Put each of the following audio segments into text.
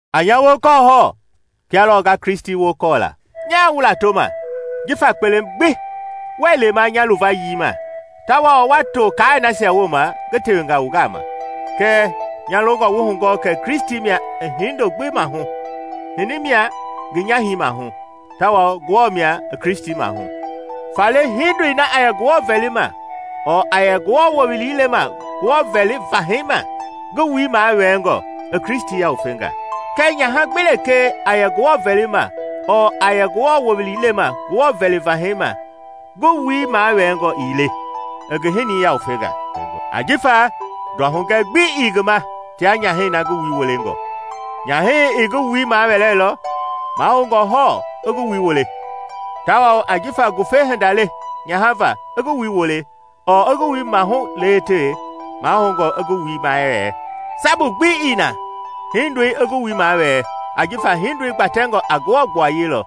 A nya wokɔɔ hɔɔ, kia lɔɔ nga Kristi wokɔɔ la. Nyaa wu latoma jifa kpelema gbi wuɛɛ lema nya luvayii ma tawao wa to kaai nasia wooma ngi tewenga wu gama. Kɛɛ nya longɔ wu hugɔɔ kɛ Kristi mia i hindo gbi mahu, hinii mia ngi nyahɛi mahu, tawao Ngewɔ mia i Kristi mahu. Faale hindoi na a yɛ Ngewɔ vɛlima ɔɔ a yɛ Ngewɔ wowili lema Ngewɔ vɛli vahɛi ma ngi wui mawɛɛngɔ, i Kristi yawufenga. Kɛɛ nyaha gbi lekee a yɛ Ngewɔ vɛlima ɔɔ a yɛ Ngewɔ wowili lema Ngewɔ vɛli vahɛi ma ngi wui mawɛɛngɔ ii le, i ngi hinii yawufenga, ajifa nduahugɛ gbi ii ngi ma tia nyahɛi na ngi wui wolengɔ. Nyahɛi ii ngi wui mawɛɛlɔ, mahoungɔ hɔɔ i ngi wui wole. Tawao jifa ngufema hinda le nyaha va i ngi wui wole ɔɔ i ngi wui maahu lewetewe, mahoungɔ i ngi wui mawɛɛ. Sabu gbi ii na hindoi i ngi wui mawɛɛ ajifa hindoi gbatɛngɔ a Ngewɔ gbuayei lɔ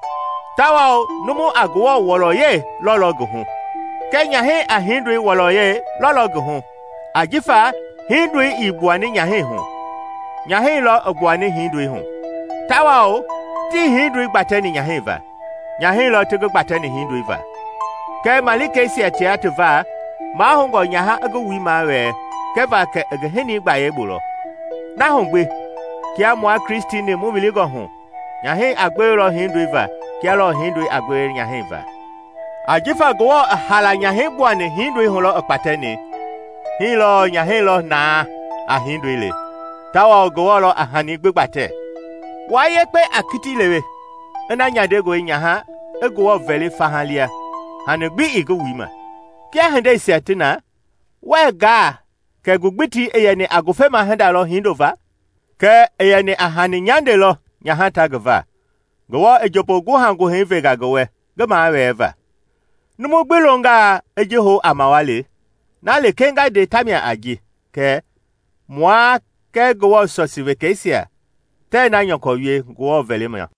tawao numu a Ngewɔ wɔlɔ yɛi lɔlɔ ngi hu. Kɛɛ nyahɛi a hindoi wɔlɔyɛi lɔlɔ ngi hu ajifa hindoi ii gbuani nyahɛi hu nyahɛi lɔ i gbuani hindoi hu. Tawao tii hiindoi gbatɛni nyahɛi va, nyahɛi lɔ ti ngi gbatɛni hindoi va. Kɛɛ malikeisia tia ti va, mahoungɔ nyaha i ngi wui mawɛɛ kɛva kɛ i ngi hinii gbayei bu lɔ. Na hu gbi kia mua Kristi-ni mu wilingɔ hu, nyahɛi a gbewelɔ hindoi va kia lɔɔ hindoi a gbewe nyahɛi va. Ajifa kia Ngewɔ i haala nyahɛi gbuani hindoi hu lɔ i kpatɛni, hii lɔɔ nyahɛi lɔ na a hindoi le; tawao Ngewɔ lɔ a hani gbi gbatɛ. Wua yekpe a kiti lewe ina nyandengɔe nyaha i Ngewɔ vɛli faha lia hani gbi ii ngi wui ma. Kia hindeisia ti na, wuɛ gaa kɛ ngugbitii i yɛni a ngufema hinda lɔ hindo va. Kɛɛ i yɛni a nyande hani lɔ nyaha ta ngi va. Ngewɔ i njombo guhaguhɛi venga ngi wɛ ngi mawɛɛva. Numu gbi longaa i ji hou a mawali, na lekee nga nde tamia a ji kɛ, mua kɛɛ Ngewɔ sɔsii wekeisia tɛɛ na nyɔkɔ wie Ngewɔ vɛlima.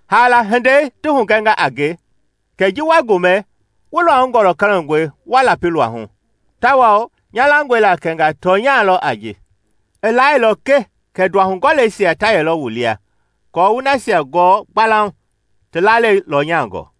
Haala hindei, ti hugɛnga a nge kɛ ji wa gomɛ, wu luahu gɔlɛkɔlɛngɔe wa lapi luahu; tawao nya langɔe la kɛnga tɔnya le a ji. I laailɔ ke kɛ nduahugɔɔleisia ta yɛlɔ wu lia aako wu nasia gɔɔ gbalauŋ ti lalei lɔnyangɔ.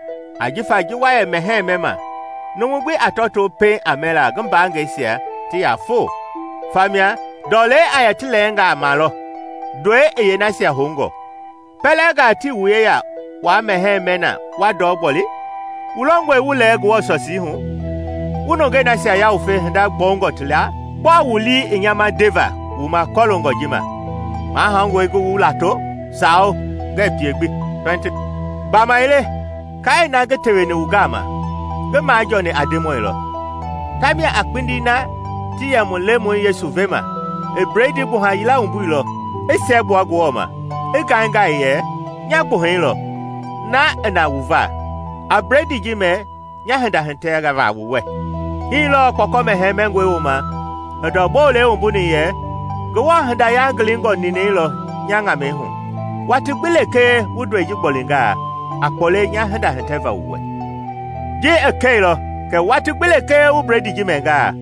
Ajifa ji wa yɛ mɛhɛɛ mɛma, numu gbi a tɔtoo pɛiŋ a mɛla ngi mbaangɛisia ti yaa foo, famia ndɔlei a yɛ ti lɛɛngaa ma lɔ, ndɔi i yeenasia houngɔ. Pɛlɛngaa tii wu yeya waa mɛhɛɛ mɛ na, wa ndɔ gboli? Wu longɔe wu lɛɛ Ngewɔ sɔsii hu, wu nungei nasia yawufe hinda gbɔungɔ ti laa? Gbɔɔ wu lii i nya ma ndeva wu ma kɔloongɔ ji ma? Mahoungɔe ngi wu lato? Sawo, ngɛɛ pie gbi! Gbamaile kaai na ngi teweni wu gama, ngi majɔɔni a Ndemɔi lɔ, tamia a kpindi na ti yɛ mu Lemɔi Yesu vema, i Bledii gbuha yila wumbuilɔ, i siɛgbua Ngewɔ ma, i ngaingai yɛ, “Nya gbuahɛi lɔ, na i na wu va. A Bledii ji mɛ nya hinda hitɛva wu wɛ.” Hii lɔɔ kpɔkɔ mɛhɛɛ mɛngɔi wooma i ndɔ bolei wumbuni yɛ, “Ngewɔ hinda yangilingɔ ninɛi lɔ nya ŋamɛi hu. Watii gbi lekee wu ndɔi ji gbolingaa, a kpɔle nya hinda hitɛva wu wɛ.” Ji i kɛilɔ kɛ watii gbi lekee wu bledii ji mɛngaa,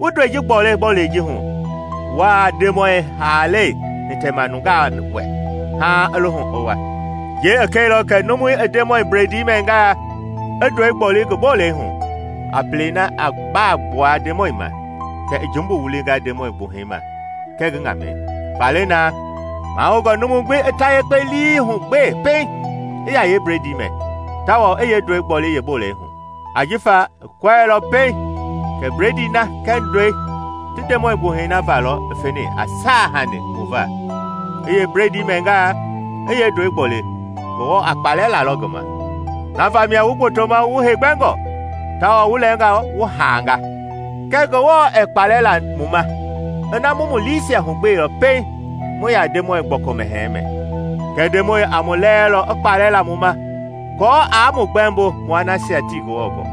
wu ndɔi ji gboli bolei ji hu, wuaa Ndemɔi haalei hitɛma nungaa wɛ haaŋ i lohu i wa. Ji i kɛilɔ kɛ numu i Ndemɔi bledii mɛngaa, i ndɔi gboli ngi bolei hu, a pelei na a baa gbua Ndemɔi ma, kɛ i jumbu wulinga Ndemɔi gbuhɛi ma kɛɛ ngi ŋamɛi. Faale na, mahoungɔ numu gbi i ta yekpe lii hugbee pɛiŋ i yaa yeebledii mɛ, tawao i yeendɔi gboli yeebolei hu. Ajifa ii kɔɛilɔ pɛiŋ kɛ bledii na kɛɛ ndɔi ti Ndemɔi gbuhɛi na va lɔ i feni a saahanii mu va, i yeebledii mɛngaa, i yeendɔi gboli, Ngewɔ a kpalɛ lalɔ ngi ma. Na vamia wu gbotoma wu heegbɛngɔ, tawao wu lɛɛnga wu haanga. Kɛɛ Ngewɔ ɛɛ kpalɛ la mu ma ina mu mu liisia hugbeilɔ pɛiŋ mu yaa Ndemɔi Gbɔkɔ Mɛhɛɛ mɛ. Kɛɛ Ndemɔi a mu lɛɛlɔ i kpalɛ la mu ma aako aa mu gbɛmbo mua nasia tii Ngewɔ gɔɔ.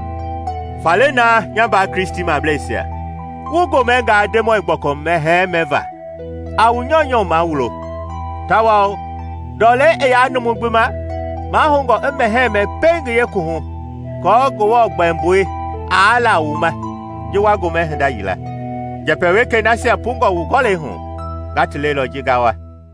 Faale na, nya mbaa Kristimableisia, wu gomɛngaa Ndemɔi Gbɔkɔ Mɛhɛɛ mɛva, a wu nyɔunyɔ mawulo. Tawao ndɔlei i yaa numu gbi ma, mahoungɔ i mɛhɛɛ mɛ pɛiŋ ngi yeekuwuhu aako Ngewɔ gbɛmbui aa la wu ma ji wa gomɛ hinda yila. Njɛpɛ wekei nasia pungɔ wu gɔlɛi hu, nga ti lelɔ ji nga wa.